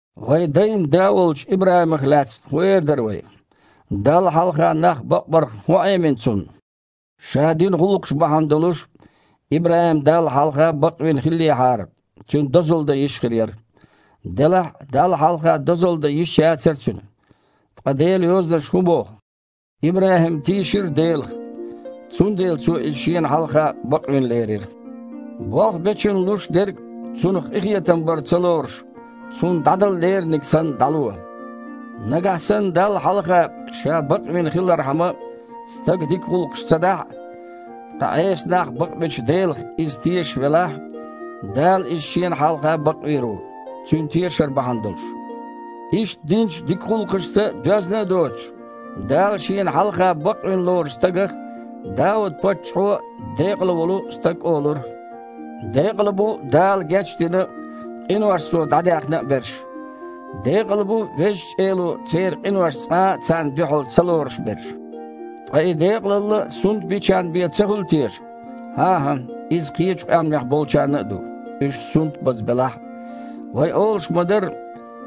Вайн дайн да волчу ИбрахІимах лаьцна хІун эр дара вай? Далла хьалха нах бакъбарх хІун Іемина цунна? Ша дина гІуллакхаш бахьана долуш, ИбрахІим Далла хьалха бакъвина хиллехьара, цуьнан дозалла дан йиш хир яра. Делахь а Далла хьалха дозалла дан йиш яцара цуьнан. Ткъа Делан Йозанаша хІун боху? «ИбрахІим тийшира Делах, цундела Цо иза Шена хьалха бакъвина лерира». Болх бечунна луш дерг, цунах къинхетам бар ца лоруш, цунна дІадала леринарг санна дІало. Нагахь санна Далла хьалха ша бакъвина хилархьама стага дика гІуллакхаш ца дахь а, ткъа Іеса нах бакъбечу Делах иза тешаш велахь, Дала иза Шена хьалха бакъвийр ву, цуьнан тешар бахьана долуш. Иштта динчу дика гІуллакхашца доьзна а доцуш, Дала Шена хьалха бакъвина лоручу стагах Дауд-паччахьо а декъала волу стаг олура: «Декъала бу Дала гечдина а, къинош Цо дІадаьхна а берш. Декъала бу Везачу Эло церан къинош цкъа а царна дуьхьал ца лоруш берш». Ткъа и декъалалла сунтбиначарна бен ца хуьлу теша? ХІан-хІа, иза кхечу къаьмнех болчарна а ду, уьш сунтбаза белахь а. Вай олуш ма-дарра,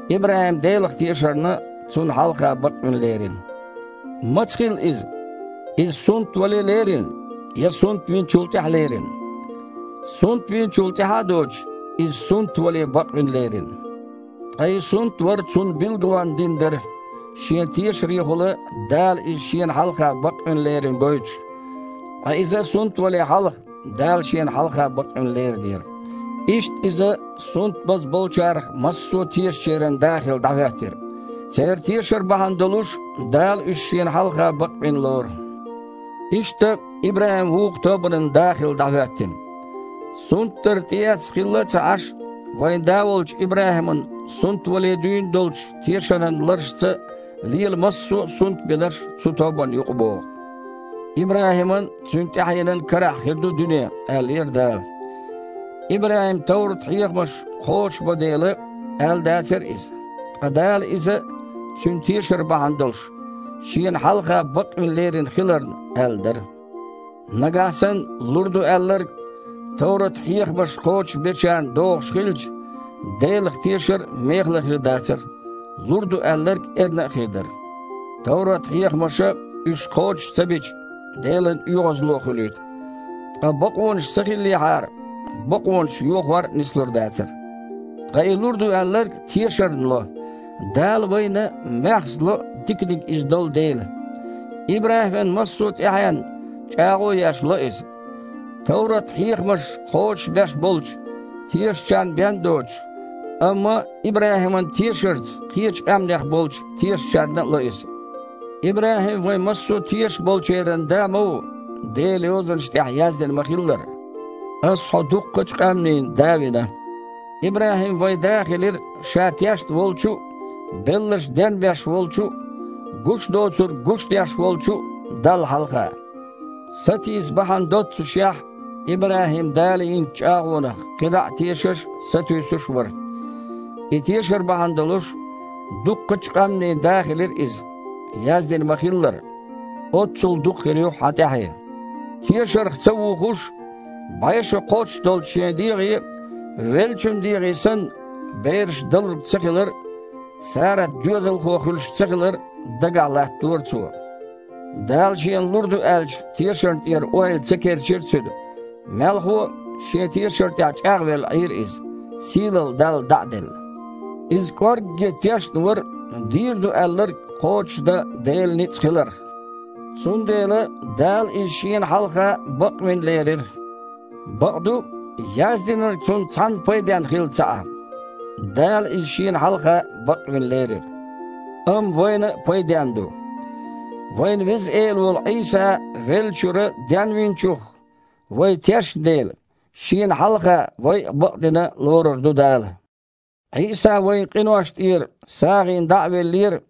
ИбрахІим Делах тешарна, Цунна хьалха бакъвина лерина. Маца хилла иза? Иза сунтвале лерина я сунтвиначул тІаьхьа лерина? Сунтвинчул тІаьхьа а доцуш, иза сунтвале бакъвина лерина. Ткъа и сунтвар цунна билгалонна дина дара, шен тешарехула Дала иза Шена хьалха бакъвина лерина гойтуш. Ткъа иза сунтвале хьалха Дала Шена хьалха бакъвина леринера. Иштта иза сунтбаза болчарах массо а тешачеран да хилла дІахІоьттира. Церан тешар бахьана долуш Дала уьш Шена хьалха бакъбина лору. Иштта, ИбрахІим вукху тобанан а да хилла дІахІоьттина. Сунтдар тІеэцна хилла а ца Іаш, вайн да волчу ИбрахІиман сунтвале дуьйна долчу тешаран ларашца лела массо а сунтбинарш цу тобанна юкъабогІу. ИбрахІиман а, цуьнан тІаьхьенан а карахь хир ду дуьне, аьллера Дала. ИбрахІима товрат-хьехамаш кхочушбо дела, аьлла дацара иза, ткъа Дала иза, цуьнан тешар бахьана долуш, Шена хьалха бакъвина лерина хиларна аьлла дара. Нагахь санна лур ду аьлларг товрат-хьехамаш кхочушбечарна догІуш хилча, Делах тешар а мехала хир дацара, лур ду аьлларг эрна а хир дара. Товрат-хьехамаша, уьш кхочуш ца бича, Делан оьгІазло хуьлуьйту. Ткъа бакъонаш ца хиллехьара, бакъонаш йохор а нислур дацара. Ткъа и лур ду аьлларг тешарна ло, Дала вайна маьхза ло диканиг иза долу дела. ИбрахІиман массо а тІаьхьенна, чІагІо а еш, ло иза. Товрат-хьехамаш кхочушбеш болчу тешачарна бен а доцуш, амма ИбрахІиман тешарца кхечу къаьмнех болчу тешачарна а ло иза. ИбрахІим вайн массо а тешаш болчеран да ма ву, Делан Йозанаш тІехь яздина ма-хиллара: «Аса хьо дуккхачу а къаьмнийн да вина». ИбрахІим вайн да хилира ша тешна волчу а, белларш денбеш волчу а, гуш доцург гуш деш волчу а Далла хьалха. Сатийса бахьана доццушехь, ИбрахІим Дала йинчу чІагІонах кхидІа а тешаш а, сатуьйсуш а вара. И тешар бахьана долуш, дуккхачу а къаьмнийн да хилира иза. Яздина ма-хиллара: «Оццул дукха хир ю хьан тІаьхье». Тешарх ца вухуш, бІе шо кхоччуш долчу шен дегІе, веллачун дегІе санна, бераш далург цахилар а, Сарат доьзалхо хуьлуш цахилар а дагахь латтадора цо. Дала шена лур ду аьллачу тешарна тІера ойла ца керчира цуьнан, мелхо а, шен тешар тІехь чІагІвелла Іийра иза, сийлалла Далла дІа а делла. Иза кІоргге тешна вара дийр ду аьлларг кхочушдан Делан ницкъ хиларх. Цундела «Дала иза Шена хьалха бакъвина лерира». Бакъду, яздинарг цунна цхьанна пайденна хилла ца Іа – «Дала иза Шена хьалха бакъвина лерира», амма вайна а пайденна ду: вайн Веза Эла волу Іийса веллачуьра Денвинчух вай тешна дела, Шена хьалха вай а бакъдина лорур ду Дала. Іийса вайн къиношна тІера сагІина дІа а веллера,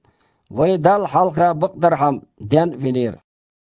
вай Далла хьалха бакъдархьама ден а винера.